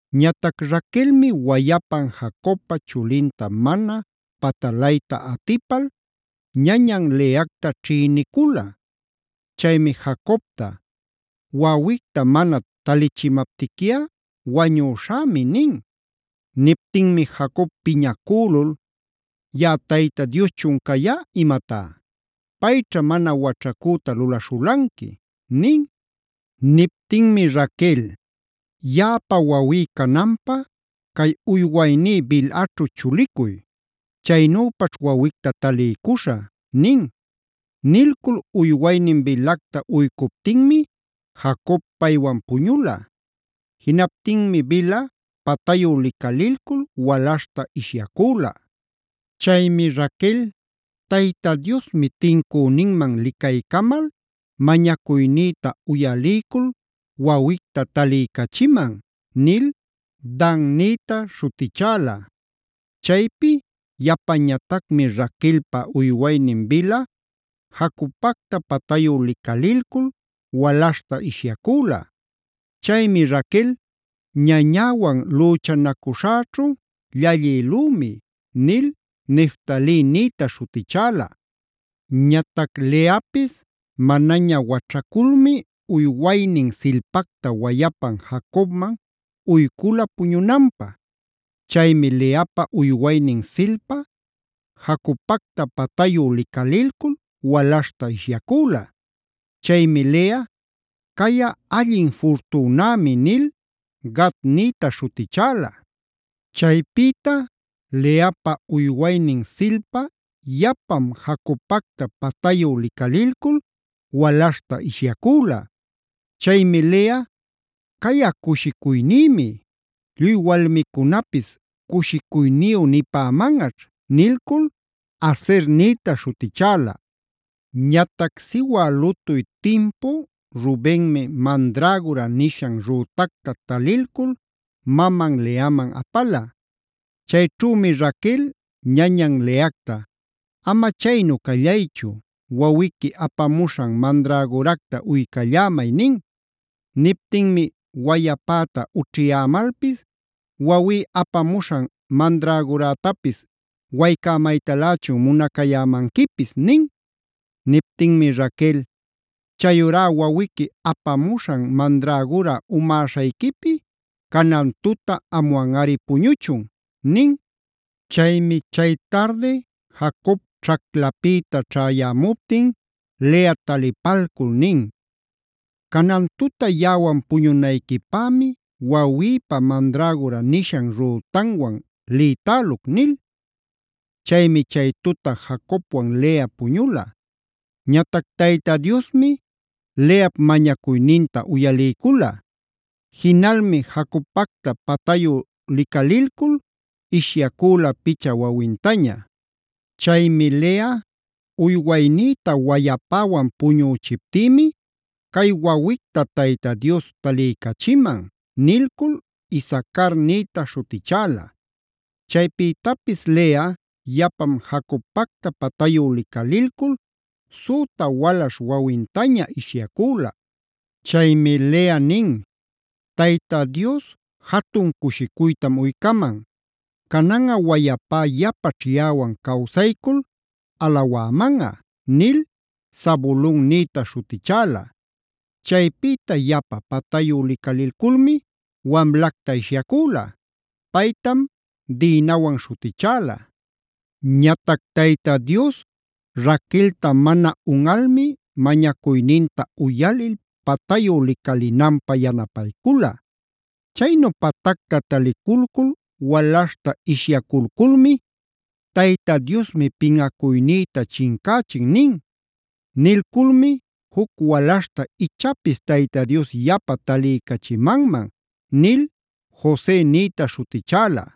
Ñatac Raquelmi wayapan Jacobpa chulinta mana patalayta atipal, ñañan Leacta ćhïnicula. Chaymi Jacobta: “Wawicta mana talichimaptiquiꞌa wañüśhämi” nin. Niptinmi Jacob piñacülul: “Yaꞌa Tayta Dioschun cayá imatá. ¡Payćhá mana waćhacüta lulaśhulanqui!” nin. Niptinmi Raquel: “Yaꞌapa wawí cananpä cay uywayní Bilhaćhu chulicuy. Chaynüpaćh wawicta taliycuśhä” nin. Nilcul uywaynin Bilhacta uycuptinmi Jacob paywan puñula. Jinaptinmi Bilha patayu licalilcul walaśhta ishyacüla. Chaymi Raquel: “Tayta Diosmi tincüninman licaycamal, mañacuynïta uyaliycul wawicta taliycachiman” nil Dan nïta śhutichäla. Chaypi yapañatacmi Raquelpa uywaynin Bilha Jacobpacta patayu licalilcul walaśhta ishyacüla. Chaymi Raquel: “Ñañäwan lüchanacuśhäćhu llallïlümi” nil Neftali nïta śhutichäla. Ñatac Leapis manaña waćhaculmi uywaynin Zilpacta wayapan Jacobman uycula puñunanpä. Chaymi Leapa uywaynin Zilpa Jacobpacta patayu licalilcul walaśhta ishyacüla. Chaymi Lea: “Cayꞌa allin furtünämi” nil Gad nïta śhutichäla. Chaypïta Leapa uywaynin Zilpa yapam Jacobpacta patayu licalilcul walaśhta ishyacüla. Chaymi Lea: “Cayꞌa cushicuynïmi. Lluy walmicunapis cushicuyniyu nipämanꞌaćh” nilcul Aser nïta śhutichäla. Ñatac siwä lutuy timpu Rubenmi “mandragora”a nishan rütacta talilcul maman Leaman apala. Chayćhümi Raquel ñañan Leacta: “Ama chaynu callaychu, wawiqui apamuśhan mandragoracta uycallämay” nin. Niptinmi: “Wayapäta ućhiyämalpis, wawí apamuśhan mandragorätapis waycämaytalächun munacayämanquipis” nin. Niptinmi Raquel: “Chayurá wawiqui apamuśhan mandragora umäśhayquipi canan tuta amwanꞌari puñuchun” nin. Chaymi chay tardi Jacob ćhaclapïta ćhayämuptin Lea talipalcul nin: “Canan tuta yaꞌawan puñunayquipämi wawïpa mandragora nishan rütanwan lïtäluc” nil. Chaymi chay tuta Jacobwan Lea puñula. Ñatac Tayta Diosmi Leap mañacuyninta uyaliycula. Jinalmi Jacobpacta patayu licalilcul ishyacüla picha wawintaña. Chaymi Lea: “Uywaynïta wayapäwan puñüchiptïmi cay wawicta Tayta Dios taliycachiman” nilcul Isacar nïta śhutichäla. Chaypïtapis Lea yapam Jacobpacta patayu licalilcul süta walaśh wawintaña ishyacüla. Chaymi Lea nin: “Tayta Dios jatun cushicuytam uycaman. Cananꞌa wayapá yapaćh yaꞌawan cawsaycul alawämanꞌa” nil Zabulon nïta śhutichäla. Chaypïta yapa patayu licalilculmi wamlacta ishyacüla. Paytam Dinawan śhutichäla. Ñatac Tayta Dios Raquelta mana unꞌalmi mañacuyninta uyalil patayu licalinanpä yanapaycula. Chaynu patacta taliculcul walaśhta ishyaculculmi: “Tayta Diosmi pinꞌacuynïta chincächin” nin. Nilculmi “juc walaśhta ichapis Tayta Dios yapa taliycachimanman” nil Jose nïta śhutichäla.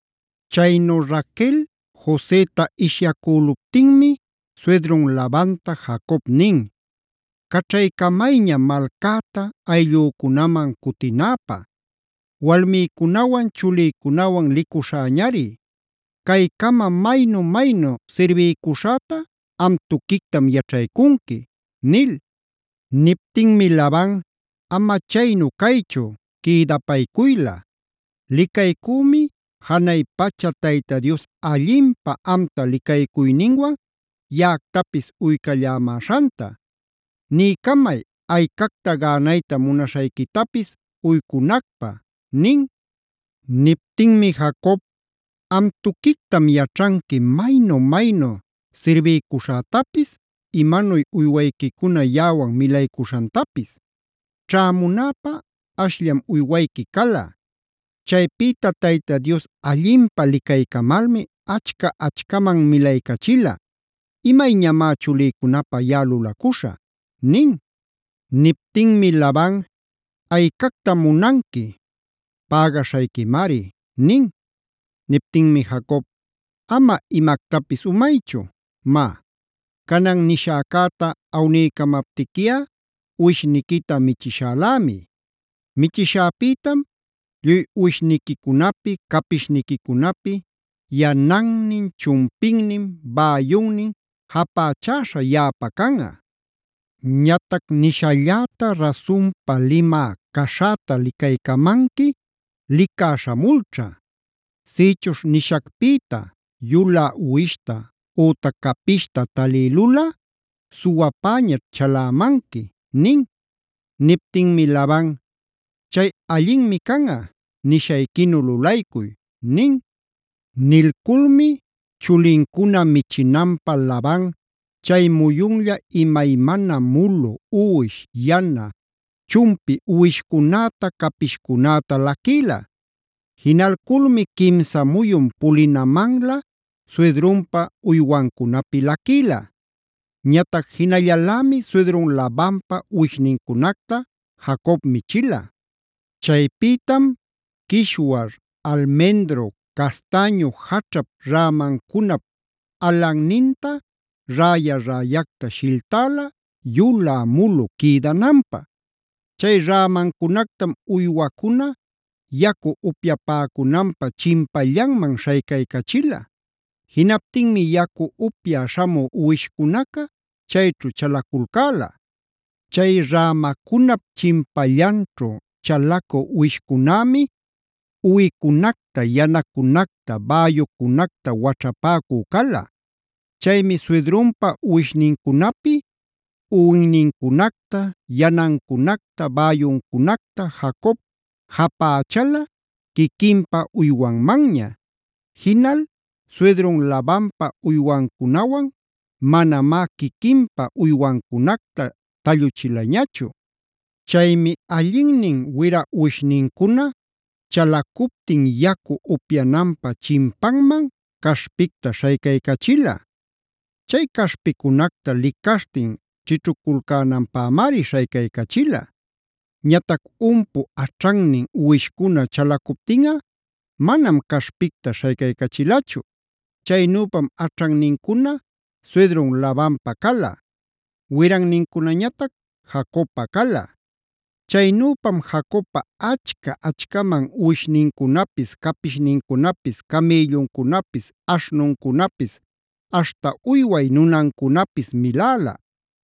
Chaynu Raquel Joseta ishyacüluptinmi suydrun Labanta Jacob nin: “Caćhamayña malcäta, ayllücunaman cutinäpä. Walmïcunawan, chulïcunawan licuśhäñari. Caycama maynu-maynu sirbiycuśhäta am tuquictam yaćhaycunqui” nil. Niptinmi Laban: “Ama chaynu caychu quïdapaycuyla. Licaycümi, janay pacha Tayta Dios allinpä amta licaycuyninwan yaꞌactapis uycallämäśhanta. Niycamay, aycacta gänayta munaśhayquitapis uycunacpä” nin. Niptinmi Jacob: “Am tuquictam yaćhanqui maynu-maynu sirbiycuśhätapis, imanuy uywayquicuna yaꞌawan milaycuśhantapis. Ćhämunäpä ashllam uywayqui cala. Chaypïta Tayta Dios allinpä licaycamalmi achca-achcaman milaycachila. ¿Imayñamá chulïcunapä yaꞌa lulacuśha?” nin. Niptinmi Laban: “¿Aycactam munanqui? Pägaśhayquimari” nin. Niptinmi Jacob: “Ama imactapis umaychu. Má, canan nishäcäta awniycamaptiquiꞌa uwishniquita michishälämi. Michishäpïtam lluy uwishniquicunapi, capishniquicunapi yanannin, chumpinnin, bäyunnin japächäśha yaꞌapä canꞌa. Ñatac nishalläta rasunpa limä caśhäta licaycamanqui licá śhamulćha. Sïchuśh nishacpïta yulä uwishta ütac capishta talïlulꞌa suwapäñaćh chalämanqui” nin. Niptinmi Laban: “Chay allinmi canꞌa, nishayquinu lulaycuy” nin. Nilculmi chulincuna michinanpä Laban chay muyunlla imaymana mulu, uwi, yana, chumpi uwishcunäta, capishcunäta laquïla. Jinalculmi quimsa muyun pulinamanla suydrunpa uywancunapi laquïla. Ñatac jinallalämi suydrun Labanpa uwishnincunacta Jacob michila. Chaypïtam quishuar, almendro, castäñu jaćhap rämancunap alanninta räya-räyacta shilltäla yulä mulu quïdananpä. Chay rämacunactam uywacuna yacu upyapäcunanpä chimpallanman śhaycaycachila. Jinaptinmi yacu upyä śhamü uwishcunaca chayćhu chalaculcäla. Chay rämacunap chimpallanćhu chalacü uwishcunämi uwicunacta, yanacunacta, bäyucunacta waćhapäcu cala. Chaymi suydrunpa uwishnincunapi uwinnincunacta, yanancunacta, bäyuncunacta Jacob japächala quiquinpa uywanmanña. Jinal suydrun Labanpa uywancunawan manamá quiquinpa uywancunacta talluchilañachu. Chaymi allinnin wira uwishnincuna chalacuptin yacu upyananpa chimpanman caśhpicta śhaycaycachila. Chay caśhpicunacta licaśhtin ćhićhuculcänanpämari śhaycaycachila. Ñatac umpu aćhannin uwishcuna chalacuptinꞌa manam caśhpicta śhaycachilachu. Chaynüpam aćhannincuna suydrun Labanpa cala; wirannincunañatac Jacobpa cala. Chaynüpam Jacobpa achca-achcaman uwishnincunapis, capishnincunapis, camïlluncunapis, aśhnuncunapis, aśhta uyway nunancunapis miläla.